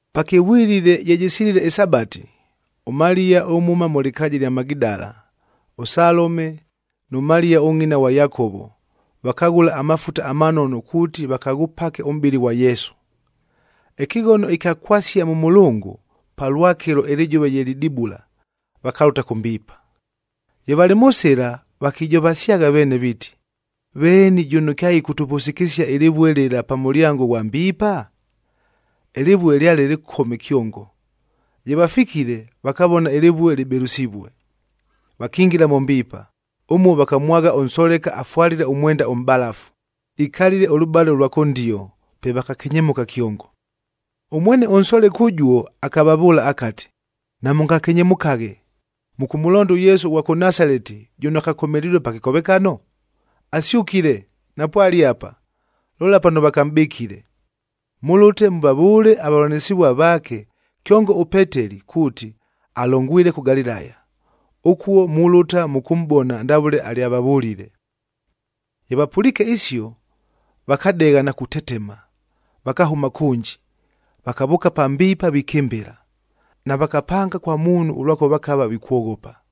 Pakɨvwilile ye jɨsilile ɨSabati, ʉMaliya ʉmhʉma mʉ lɨkaaja ɨlya Magidala, ʉSalome nʉ Maliya ʉngʼina ghwa Yakovo, vakaghʉla amafuta amanono kuuti vakaghʉpake ʉmʼbɨlɨ ghwa Yesu. Ɨkɨghono ɨkya kwasia mʉ mʉlʉngʉ,a palwakɨlo ɨlɨjʉva ye lidibula, vakalʉta kʉ mbiipa. Ye valɨ mʉ sɨla, vakijovasyagha veene viiti, “Veeni jʉno kyaɨkʉtʉvʉsɨkɨsia ɨlɨvue lɨla pa mʉlyango ghwa mbiipa?” Ɨlɨvue lyale lɨkome kyongo. Ye vafikile, vakavona ɨlɨvue lɨbɨlʉsivue. Vakingila mʉ mbiipa, ʉmuo vakamwagha ʉnsoleka afwalile ʉmwenda ʉmʼbalafu, ikalile ʉlʉbale lwa kʉndio, pe vakakenyemʉka kyongo. Ʉmwene ʉnsoleka ʉjuo akavavʉʉla akati, “Namʉngakenyemʉkaghe. Mʉkʉmʉlonda ʉYesu ʉghwa kʉ Nasaleti jʉno akakomelilue pa kɨkovekano? Asyʉkile, napwale apa! Lola pano vakamʼbɨkile. Mʉlʉte mʉvavʉʉle avavʉlanɨsɨvua vaake, kyongo ʉPeteli kuuti, alongwile kʉ Galilaya. Ʉkuo mulʉta mʉkʉmʼbona ndavʉle alyavavʉlile.” Ye vapʉliike isio, vakadegha na kutetema, vakahʉma kʉnji, vakavʉʉka pa mbiipa vikɨmbɨla. Navakapanga kwa muunhu ʉlwakʉva vakava vikwoghopa.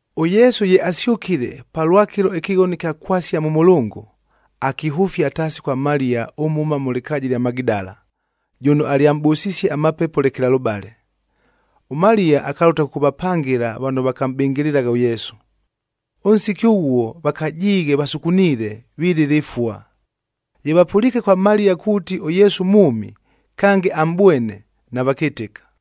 ɄYesu ye asyʉkile palwakɨlo ɨkɨghono ɨkya kwasia mʉ mʉlʉngʉ, akihʉfia taasi kwa Maliya ʉmhʉma mʉ lɨkaaja ɨlya Magidala, jʉno alyamʼbʉsisie amapepo lekelalʉbale. ɄMaliya akalʉta kʉkʉvapangɨla vano vakamʼbɨngɨlɨlagha ʉYesu, ʉnsiki ʉghuo vakajiighe vasukuniile, vilɨla ɨfua. Ye vapʉliike kwa Maliya kuuti ʉYesu mwʉmi, kange amʼbwene, navakɨtɨka.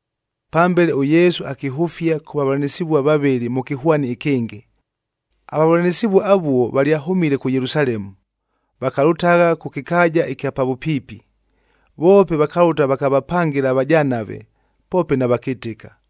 Pambele, ʉYesu akihʉfia kʉ vavʉlanɨsɨvua vavɨlɨ mʉ kɨhwani ɨkɨngɨ. Avavʉlanɨsɨvua avuo valyahʉmile kʉ Yelusalemu, vakalʉtagha kʉ kɨkaaja ɨkya pa vʉpiipi. Voope vakalʉta vakavapangɨla avajanave, poope navakɨtɨka.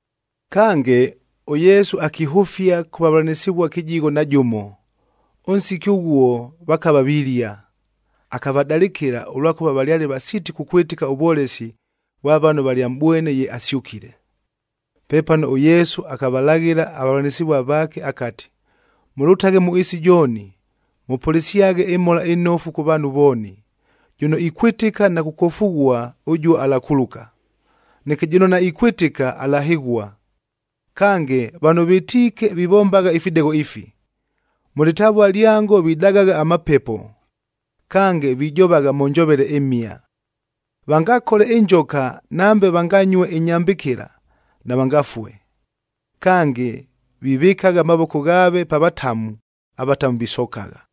Kange, ʉYesu akihʉfia kʉ vavʉlanɨsɨvua kɨjigho na jʉmo, ʉnsiki ʉghuo vakava vilia. Akavadalɨkɨla, ʉlwakʉva valyale vasiiti kukwɨtɨka ʉvwolesi vwa vano valyamʼbwene ye asyʉkile. Pepano ʉYesu akavalaghɨla avavʉlanɨsɨvua vaake akati, “Mʉlʉtaghe mʉ ɨɨsi jooni mʉpʉlɨsyaghe ɨMhola ɨNofu kʉ vaanhu vooni. Jʉno ikwɨtɨka na kukwofughua, ʉjuo alakuluka. Neke jʉno naikwɨtɨka, alahɨghua. Kange, vano vɨtiike vivombagha ifidegho ifi: Mʉ lɨtavua lyango vidagagha amapepo, kange vijovagha mʉ njovele ɨmhia. Vangakole ɨnjoka, nambe vanganyue ɨnyambɨkɨla, navangafue. Kange, vivɨkagha amavoko ghaave pa vatamu, avatamu visokagha.”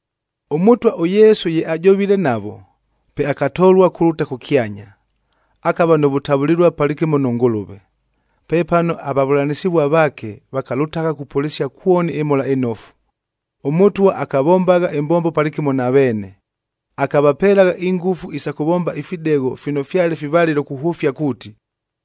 ɄMʉtwa ʉYesu ye ajovile navo, pe akatolua kulʉta kʉkyanya, akava nʉ vʉtavʉlɨlua palɨkɨmo nʉ Ngʉlʉve. Pepano avavʉlanɨsɨvua vaake vakalʉtagha kupʉlɨsia kwoni ɨMhola ɨNofu. ɄMʉtwa akavombagha ɨmbombo palɨkɨmo na veene, akavapelagha ingʉfu isa kʉvomba ifidegho fino fyale fivalɨlo kuhʉfia kuuti,